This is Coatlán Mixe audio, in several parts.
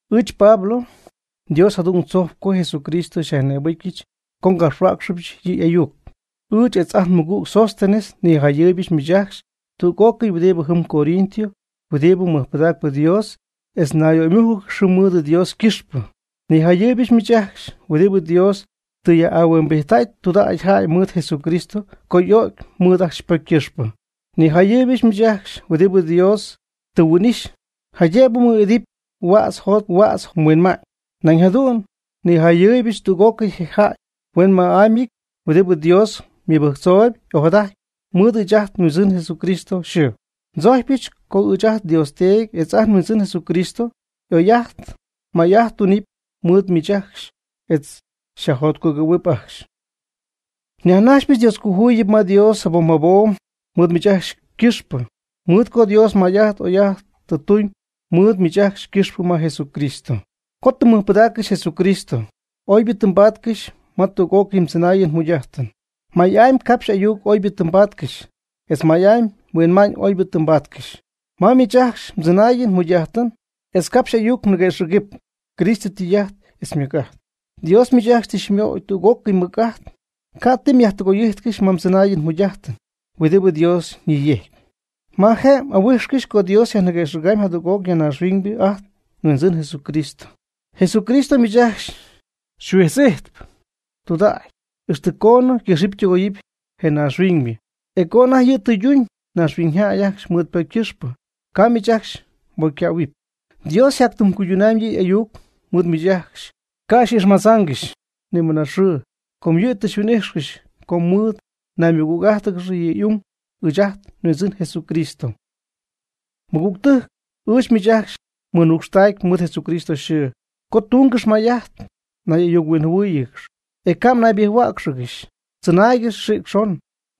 Ɨɨch Pablo, Dios jadu'n tzojcp co Jesucristo xyajnïbɨcyɨch co ngapxhuäcxɨbyɨch yɨ' y'ayuc. Ɨɨch etz ajt nmɨgüg Sóstenes nijayɨɨybɨch miich ajcxy tüg'ócɨy huɨdibɨ jɨm Corinto huɨdibɨ mɨjpɨdacp Dios etz ñayyöymújcɨgɨxy jɨm mɨɨd Dios ycɨxpɨ. Nijayɨɨybɨch miich ajcxy huɨdibɨ Dios tɨ yaj'ahuimbijttäy tudägy mɨɨd Jesucristo co y'o'cy mɨɨd ajcxy mbocy ycɨxpɨ. Nijayɨɨybɨch miich ajcxy huɨdibɨ Dios tɨ huin'ixy, jaydëbɨ mmɨɨd'idɨpy huädz jot huädz huinma'ñ. Nañ jadu'n nijayɨɨybɨch tüg'ócɨy je jäy huenyma'amyɨty huɨdibɨ Dios mɨbɨjctzoob ojadajtp mɨɨd ɨɨch ajt nHuindzɨn Jesucristo yxɨɨ. Ndzojcypɨch co ɨɨch ajt nDios Teedy etz ajt nHuindzɨn Jesucristo oy'ajt may'ajt tunɨpy mɨɨd miich ajcxy, etz xyajjotcugɨ̈huɨpy ajcxy. Nyajnajxypɨch Dioscojuyip ma Dios jabom jabom mɨɨd miich ajcxy ycɨxpɨ, mɨɨd co Dios may'ajt oy'ajt tɨ tuñ mɨɨd miich ajcxy ycɨxpɨ ma Jesucristo. Co tɨ mmɨjpɨdaaccɨxy Jesucristo, oybɨ tɨ mbaatcɨxy ma tüg'ócɨy mdzɨnaayɨn mjugy'ajtɨn. May'amy capxy ayuc oybɨ tɨ mbaatcɨxy, etz may'amy huinma'ñ oybɨ tɨ mbaatcɨxy. Ma miich ajcxy mdzɨnaayɨn mjugy'ajtɨn etz mgapxy m'ayuc ñiguëxɨ̈gɨpy Cristo ytɨy'ajt etz ymɨc'ajt. Dios miich ajcxy tɨ xymöy tüg'ócɨy ymɨc'ajt. Ca' ti myajtɨgoy'ijtcɨxy ma mdzɨnaayɨn mjugy'ajtɨn huɨdibɨ Dios ñiyejcpy, ma je' m'ahuijxcɨxy co Dios yajniguëxɨ̈ga'ñ jadüg'oc ya naaxhuiñ ajt nHuindzɨn Jesucristo. Jesucristo miich ajcxy xyhuijtz'ijtp tudägy, ixtɨ coonɨ ycɨxɨpy tɨgoyɨpy je naaxhuiñybɨ, e co anajty yɨ' tɨyduñ naaxhuiñyjäy ajcxy mɨɨd ypocy ycɨxpɨ, ca' miich ajcxy mbocycähuɨpy. Dios yjatytɨmycuydunɨpy yɨ' y'ayuc mɨɨd miich ajcxy, ca' xy'ixmadzaangɨxy ni mɨna xɨɨ, com yɨ' tɨ xyhuin'ijxcɨxy co mɨɨd mnaymɨgüg'ájtɨgɨxy yɨ' y'ung, ɨɨch ajt nHuindzɨn Jesucristo. Mɨgügtɨjc, ɨɨch miich ajcxy nmɨnucxtacyp mɨɨd Jesucristo yxɨɨ co tungɨxy may'ajt nay'ayuc-huinjɨhuɨ́ɨyɨgɨx, e ca' mnaybɨjc-huäcxɨgɨxy. Tzɨnaaygɨx xïc xon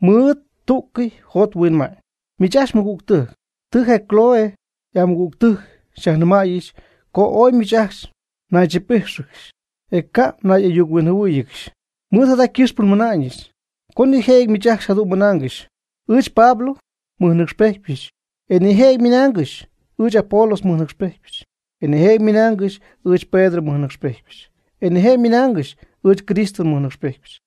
mɨɨd tú'cɨy mjot mhuinma'ñ. Miich ajcxy mɨgügtɨjc, tɨ je Cloé y'amɨgügtɨjc xyajnɨmäyɨch co ooy miich ajcxy mnaychip'íjxɨgɨxy, e ca' mnay'ayuc-huinjɨhuɨ́ɨyɨgɨxy. Mɨɨd jada ycɨxpɨ nmɨna'ñɨch co nijëjɨty miich ajcxy jadu'n mɨnaangɨxy: “Ɨɨch Pablo nmɨjnɨcxpejtpyɨch.” E nijëjɨty ymɨnaangɨxy: “Ɨɨch Apolos nmɨjnɨcxpejtpyɨch.” E nijëjɨty ymɨnaangɨxy: “Ɨɨch Pedro nmɨjnɨcxpejtpyɨch.” E nijëjɨty ymɨnaangɨxy: “Ɨɨch Cristo nmɨjnɨcxpejtpyɨch.”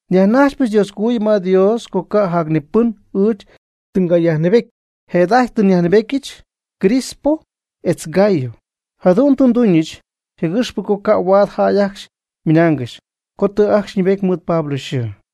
Nyajnajxypɨch Dioscojuyip ma Dios co ca' jac ni pɨn ɨɨch tɨ ngayajnɨɨbety. Jëda'ajty tɨ nyajnɨɨbetyɨch Crispo etz Gayo. Jadu'n tɨ nduñɨch je'gɨxpɨ co ca' huaad jäy ajcxy ymɨnaangɨxy co tɨ ajcxy ñɨɨbety mɨɨd Pablo yxɨɨ.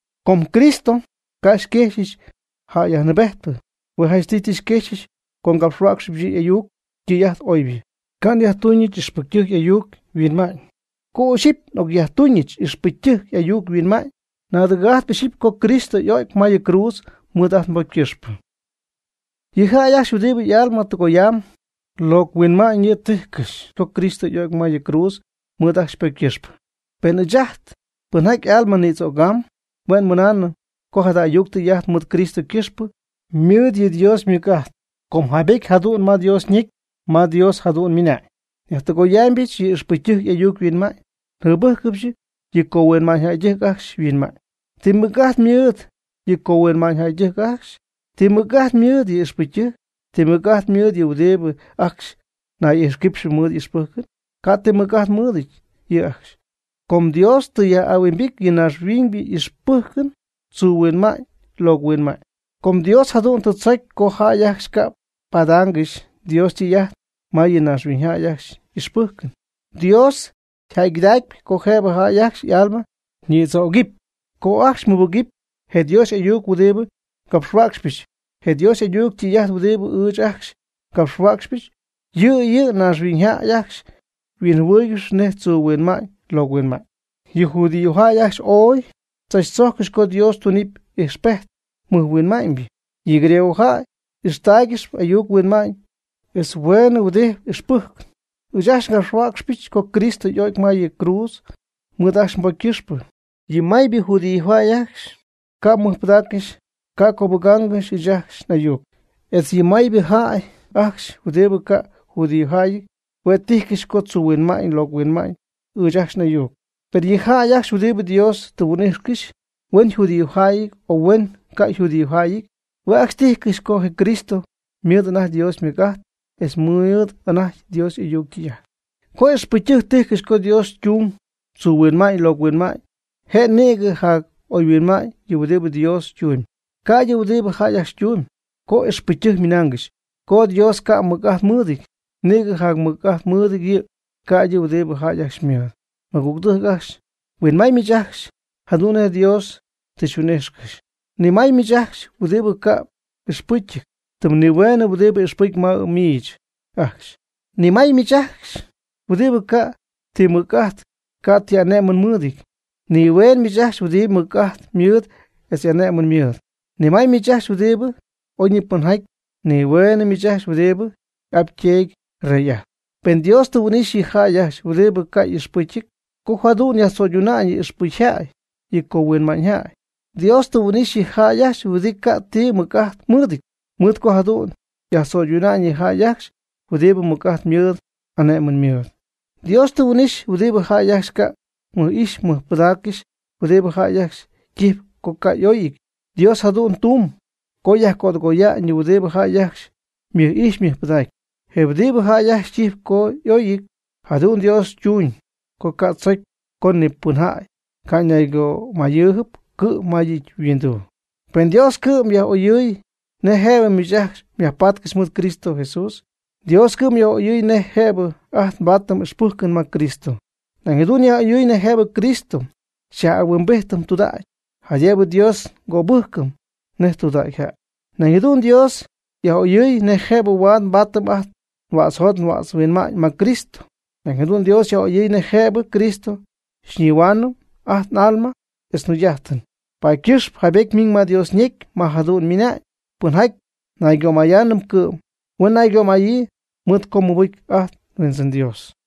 Com Cristo ca' xyquejxyɨch jäy yajnɨɨbejtpɨ. Hue' janchtɨy tɨ xyquexyɨch co ngapxhuäcxɨbɨch yɨ' y'ayuc ytɨy'ajt oybɨ. Ca' nyajtuñɨch ixpɨcytɨjc y'ayuc yhuinma'ñ. Co ixyipy nyajtuñɨch ixpɨcytɨjc y'ayuc yhuinma'ñ, naadɨgɨ̈'ajt ixyipy co Cristo y'o'cy ma yɨ cruudz mɨɨd ajt nbocy ycɨxpɨ. Yɨ jäy ajcxy huɨdibɨ y'alma tɨgoyam, locɨ huinma'ñ yɨ' tijcɨxy co Cristo y'o'cy ma yɨ cruudz mɨɨd ajcxy ypocy ycɨxpɨ. Per ɨɨch ajt pɨnjaty y'alma nïdzögam, hue' mɨnaanɨm co jada ayuc tɨy'ajt mɨɨd Cristo ycɨxpɨ, ymɨɨd yɨ' Dios ymɨc'ajt. Com jaybety jadu'n ma Dios ñecy, ma Dios jadu'n ymɨna'ñ: Nyajtɨgoyaamybɨch yɨ ixpɨcytɨjc y'ayuc yhuinma'ñ. Njɨbɨjcɨbɨch yɨ cohuinma'ñyjäydɨjc ajcxy yhuinma'ñ. ¿Ti mɨc'ajt ymɨɨd yɨ cohuinma'ñyjäydɨjc ajcxy? ¿Ti mɨc'ajt ymɨɨd yɨ ixpɨcytɨjc? ¿Ti mɨc'ajt ymɨɨd yɨ huɨdibɨ ajcxy nay'ixquipxɨp mɨɨd ixpɨjcɨn? Ca' ti mɨc'ajt mɨɨdɨty yɨ' ajcxy, com Dios tɨ yaj'ahuimbity yɨ naaxhuiñ y'ixpɨjcɨn tzuu huinma'ñ locɨ huinma'ñ. Com Dios jadu'n tɨ tzocy co jäy ajcxy ca' padaangɨxy Dios ytɨy'ajt ma yɨ naaxhuiñjäy ajcxy y'ixpɨjcɨn. Dios yjäygɨdacpy co jëbɨ jäy ajcxy y'alma ñïdzögɨpy co ajcxy mɨbɨgɨpy je Dios y'ayuc huɨdibɨ ngapxhuäcxypɨch. Je Dios y'ayuc ytɨy'ajt huɨdibɨ ɨɨch ajcxy ngapxhuäcxpy, yɨ' yɨ naaxhuiñyjäy ajcxy huinjɨhuɨɨygɨxyp nej tzuu huinma'ñ locɨ huinma'ñ. Yɨ judíojäy ajcxy ooy tzachtzojccɨxy co Dios tunɨpy ijxpejt mɨjhuinma'ñybɨ. Yɨ griego jäy y'ixtaaygɨxyp ayuc huinma'ñ etz huenhuɨdiibɨty ixpɨjcɨn. Ɨɨch ajcxy ngapxhuäcxɨch co Cristo y'o'cy ma yɨ cruudz mɨɨd jäy ajcxy ypocy ycɨxpɨ. Yɨ maybɨ judíojäy ajcxy ca' mɨjpɨdägaangɨxy ca' cöbɨgaangɨxy ɨɨch ajcxy n'ayuc. Etz yɨ maybɨ jäy ajcxy huɨdibɨ ca'p yjudíojäyɨty, hue' tijcɨxy co tzuu huinma'ñ locɨ huinma'ñ ɨɨch ajcxy n'ayuc. Per yɨ jäy ajcxy huɨdibɨ Dios tɨ yhuin'íjxɨgɨxy, huen yjudíojäyɨty, o huen ycajudíojäyɨty, hue' ajcxy tijcɨxy co je Cristo ymɨɨd anajty Dios ymɨc'ajt etz ymɨɨd anajty Dios y'ayuc ytɨy'ajt. Co ixpɨcytɨjc tijcɨxy co Dios ytung, tzuu huinma'ñ locɨ huinma'ñ je', nïgɨ jac'oyhuinma'ñ yɨ' huɨdibɨ Dios tumyb, ca'ydɨ huɨdibɨ jäy ajcxy ytumyb. Co ixpɨcytɨjc ymɨnaangɨxy co Dios ca' ymɨc'ajt mɨɨdɨty, nïgɨ jacmɨc'ajt mɨɨd yɨ', ca'ydɨ huɨdi jäy ajcxy ymɨɨd. Mɨgügtɨjc ajcxy, huinmay miich ajcxy jadu'n nej Dios tɨ xyhuin'ijxcɨxy. Ni may miich ajcxy huɨdibɨ ca' y'ixpɨcyɨty, tɨm nihueenɨ huɨdibɨ ixpɨcyɨp ma miich ajcxy. Ni may miich ajcxy huɨdibɨ ca' ti mɨc'ajt, ca' ti ane'mɨn mɨɨdɨty. Ni hueeñ miich ajcxy huɨdibɨ mɨc'ajt mɨɨd etz ane'mɨn mɨɨd. Ni may miich ajcxy huɨdibɨ oyñipɨnjäyɨty. Ni hueenɨ miich ajcxy huɨdibɨ y'ap yteedy rey'ajtp. Per Dios tɨ huin'ixy yɨ jäy ajcxy huɨdibɨ ca' y'ixpɨcyɨty co jadu'n yajtzo'yduna'ñ yɨ ixpɨcyjäy yɨ cohuinma'ñjäy. Dios tɨ huin'ixy yɨ jäy ajcxy huɨdibɨ ca' ti mɨc'ajt mɨɨdɨty, mɨɨd co jadu'n yajtzo'yduna'ñ yɨ jäy ajcxy huɨdibɨ mɨc'ajt mɨɨd, ane'mɨn mɨɨd. Dios tɨ huin'ixy huɨdibɨ jäy ajcxy ca' mɨj'ijx mɨjpɨdaaccɨxy, huɨdibɨ jäy ajcxy ytijpy co ca' y'oyɨty. Dios jadu'n tuuñ co yajcödɨgoya'ñ yɨ huɨdibɨ jäy ajcxy mɨj'ijxp mɨjpɨdacp, je huɨdibɨ jäy ajcxy ytijpy co y'oyɨty. Jadu'n Dios ytuñ co ca' tzocy co ni pɨnjäy ca' ñaygömayɨɨyb cɨ'm ma yɨ' yhuinduu. Per Dios cɨ'm yaj'oyɨɨy nej jëbɨ miich ajcxy myajpatcɨxy mɨɨd Cristo Jesús. Dios cɨ'm yaj'oyɨɨy nej jëbɨ ajt nbaatɨm ixpɨjcɨn ma Cristo. Nañ jadu'n yaj'oyɨɨy nej jëbɨ Cristo xyaj'ahuimbijtɨm tudägy, jaydëbɨ Dios xycöbɨjcɨm nej tudägy jäy. Nañ jadu'n Dios yaj'oyɨɨy nej jëbɨ huaad nbaatɨm ajt nhuädzjot nhuädzhuinma'ñ ma Cristo. Nañ jadu'n Dios yaj'oyɨɨy nej jëbɨ Cristo xyñihuaanɨm ajt n'alma etz njugy'ajtɨn. Paady ycɨxpɨ jaybety ymiñ ma Dios ñecy, ma jadu'n ymɨna'ñ: “Pɨnjaty naygömayaanɨp cɨ'm, huen naygömayii mɨɨd co mɨbɨcy ajt nHuindzɨn Dios.”